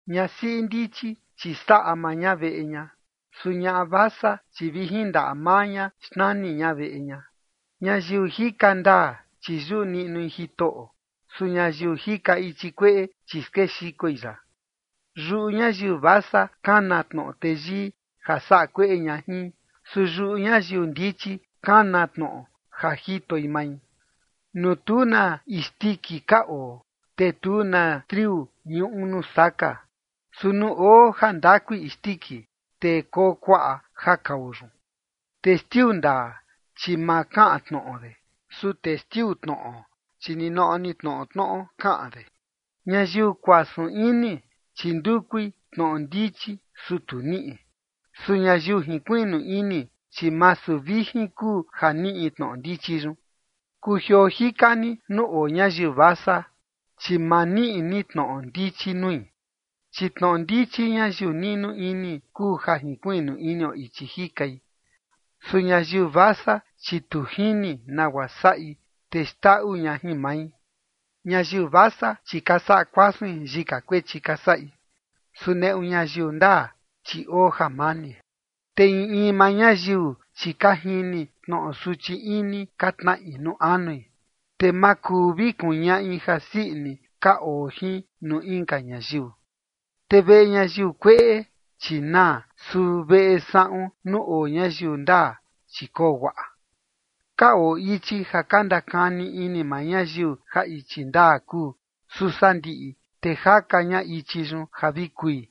Ñasiꞌi ndichi, chi saꞌa maa ña veꞌe ña. Su ñaꞌa vasa, chi vi jin ndaꞌa maa ña xnani ña veꞌe ña. Ñayiu jika ndaa, chi yuꞌu niꞌnui Jitoꞌo. Su ñayiu jika ichi kueꞌe, chi skexikoi ya. Yuꞌu ñayiu vasa kana tnoꞌo teyii ja saꞌa kueꞌe ña jin. Su yuꞌu ñayiu ndichi kana tnoꞌo ja jitoi mai. Nuu tu na isndiki ka oo, te tu na triu ñuꞌu nuu saka. Su nuu oo ja ndakui isndiki, te koo kuaꞌa ja kao yun. Testiu ndaa, chi ma kaꞌan tnoꞌo de. Su testiu tnoꞌo, chi ninoꞌo ni tnoꞌo tnoꞌo kaꞌan de. Ñayiu kuasun ini, chi ndukui tnoꞌo ndichi, su tu niꞌi. Su ñayiu jinkuiꞌnu ini, chi masu vijin kuu ja niꞌi tnoꞌo ndichi yun. Kujioo jika ni nuu oo ñayiu vasa, chi ma niꞌi ni tnoꞌo ndichi nui. Chi tnoꞌo ndichi ñayiu niꞌnu ini kuu ja jinkuiꞌnu inio ichi jikai. Su ñayiu vasa, chi tu jini nagua saꞌi, te xndaꞌu ña jin mai. Ñayiu vasa, chi ka saꞌa kuasuin yika kuechi ka saꞌi. Su neꞌu ñayiu ndaa, chi oo jamani. Te in in maa ñayiu, chi ka jini tnoꞌo suchi ini ka tnaꞌi nuu anui, te ma kuu vi kuñaꞌi jasii ini ka oo jin nuu inka ñayiu. Te veꞌe ñayiu kueꞌe, chi naa. Su veꞌe saꞌun nuu oo ñayiu ndaa, chi koo guaꞌa. Ka oo ichi ja ka ndakani ini maa ñayiu ja ichi ndaa kuu. Su sandiꞌi, te jaka ña ichi yun ja vi kui.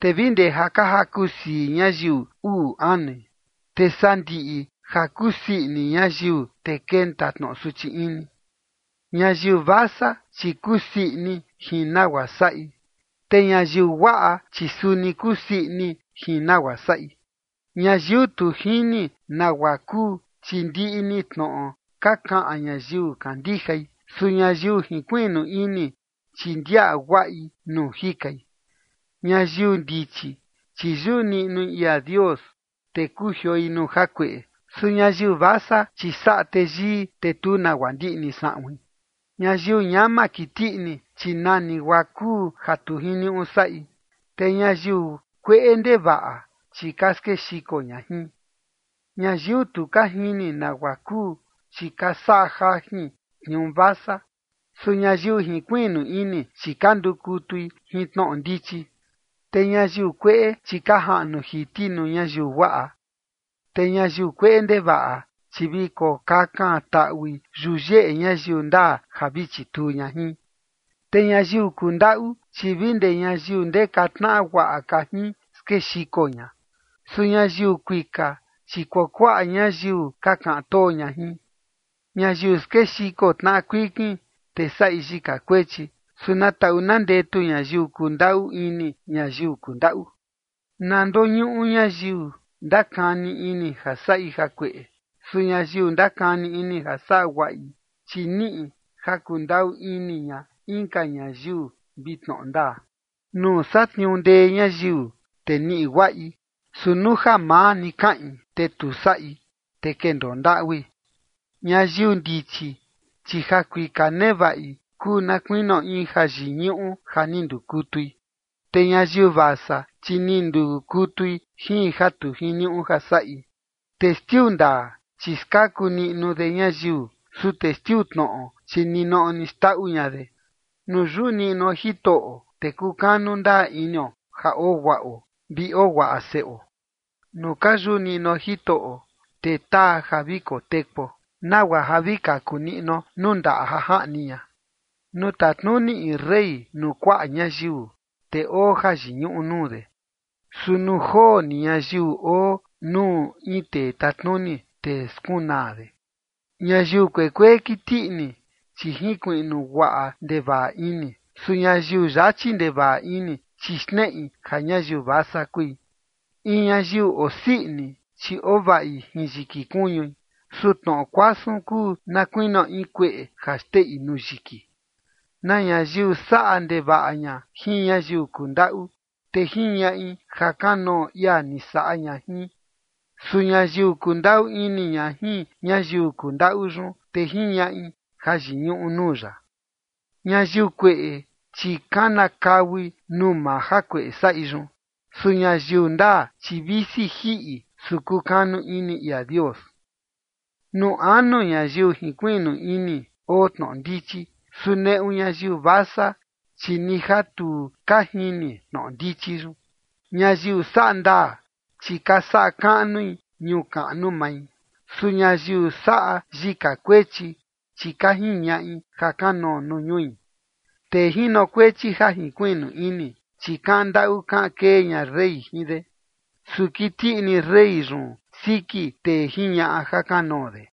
Te vi ndee ja jaku sii ñayiu uꞌu anui, te sandiꞌi ja kusii ini ñayiu, te kenta tnoꞌo suchi ini. Ñayiu vasa, chi kusii ini jin nagua saꞌi, te ñayiu guaꞌa, chi suni kusii ini jin nagua saꞌi. Ñayiu tu jini nagua kuu, chi ndiꞌi ni tnoꞌo ka kaꞌan ñayiu kandijai. Su ñayiu jinkuiꞌnu ini, chi ndiaꞌa guaꞌi nuu jikai. Ñayiu ndichi, chi yuꞌu niꞌnui ia Dios, te kujioi nuu jakueꞌe. Su ñayiu vasa, chi saꞌa teyii, te tu nagua ndiꞌni saꞌuin. Ñayiu ñama kiti ini, chi nani guaa kuu ja tu jiniuꞌu saꞌi. Te ñayiu kueꞌe ndevaꞌa, chi ka skexiko ña jin. Ñayiu tu ka jini nagua kuu, chi ka saꞌa jajin tniuu vasa. Su ñayiu jinkuiꞌnu ini, chi ka ndukutui jin tnoꞌo ndichi. Te ñayiu kueꞌe, chi ka jaꞌnu jiti nuu ñayiu guaꞌa. Te ñayiu kueꞌe ndevaꞌa, chi vi kokakan taꞌui yuyeꞌe ñayiu ndaa ja vi chituu ña jin. Te ñayiu kundaꞌu, chi vi ndee ñayiu ndeka tnaꞌa guaꞌa ka jin skexiko ña. Su ñayiu kuika, chi kuakuaꞌa ñayiu ka kaꞌan too ña jin. Ñayiu skexiko tnaꞌa kuikin, te saꞌi yika kuechi. Su na taꞌu na ndetu ñayiu kundaꞌu ini ñayiu kundaꞌu. Naa ndoñuꞌu ñayiu ndakani ini ja saꞌi jakueꞌe. Su ñayiu ndakani ini ja saꞌa guaꞌi, chi niꞌi ja kundaꞌu ini ña inka ñayiu vi tnoꞌo ndaa. Nuu satniuu ndee ñayiu, te niꞌi guaꞌi. Su nuu ja maa ni kaꞌin, te tu saꞌi, te kendoo ndaꞌui. Ñayiu ndichi, chi ja kuika nevaꞌi kuu na kuinio in jayiñuꞌu ja ni ndukutui. Te ñayiu vasa, chi ni ndukutui jin ja tu jiniuꞌu ja saꞌi. Testiu ndaa, chi skaku niꞌnu de ñayiu. Su testiu tnoꞌo, chi ninoꞌo ni xndaꞌu ña de. Nuu yuꞌu niꞌnuo Jitoꞌo, te kukanu ndaa inio ja oo guaꞌo, vi oo guaꞌa seꞌo. Nuu ka yuꞌu niꞌnuo Jitoꞌo, te taa ja vi kotekuo, nagua ja vi kaku niꞌnuo nuu ndaꞌa ja jaꞌni ña. Nuu tatnuni in rey nuu kuaꞌa ñayiu, te oo jayiñuꞌu nuu de. Su nuu joo ni ñayiu oo nuu in tee tatnuni, te skunaa de. Ñayiu kuekuee kiti ini, chi jinkuiꞌnu guaꞌa ndevaꞌa ini. Su ñayiu yachi ndevaꞌa ini, chi xneꞌi ja ñayiu vasa kui. In ñayiu osii ini, chi ovaꞌi jin yiki kuñui. Su tnoꞌo kuasun kuu na kuinio in kueꞌe ja xteꞌi nuu yiki. Na ñayiu saꞌa ndevaꞌa ña jin ñayiu kundaꞌu, te jiñaꞌi ja kanoo ia ni saꞌa ña jin. Su ñayiu kundaꞌu ini ña jin ñayiu kundaꞌu yun, te jiñaꞌi jayiñuꞌu nuu ya. Ñayiu kueꞌe, chi kanakaui nuu maa jakueꞌe saꞌi yun. Su ñayiu ndaa, chi visi jiꞌi, su kukanu ini ia Dios. Nuu anu ñayiu jinkuiꞌnu ini oo tnoꞌo ndichi. Su neꞌu ñayiu vasa, chi ni ja tu ka jini tnoꞌo ndichi yun. Ñayiu saꞌa ndaa, chi ka saꞌa kaꞌnui ñuu kaꞌnu mai. Su ñayiu saꞌa yika kuechi, chi ka jiñaꞌi ja kanoo nuu ñui. Tee jinokuechi ja jinkuiꞌnu ini, chi kaꞌan ndaꞌu kaꞌan kee ña rey jin de. Su kiti ini rey yun siki tee jiñaꞌa ja kanoo de.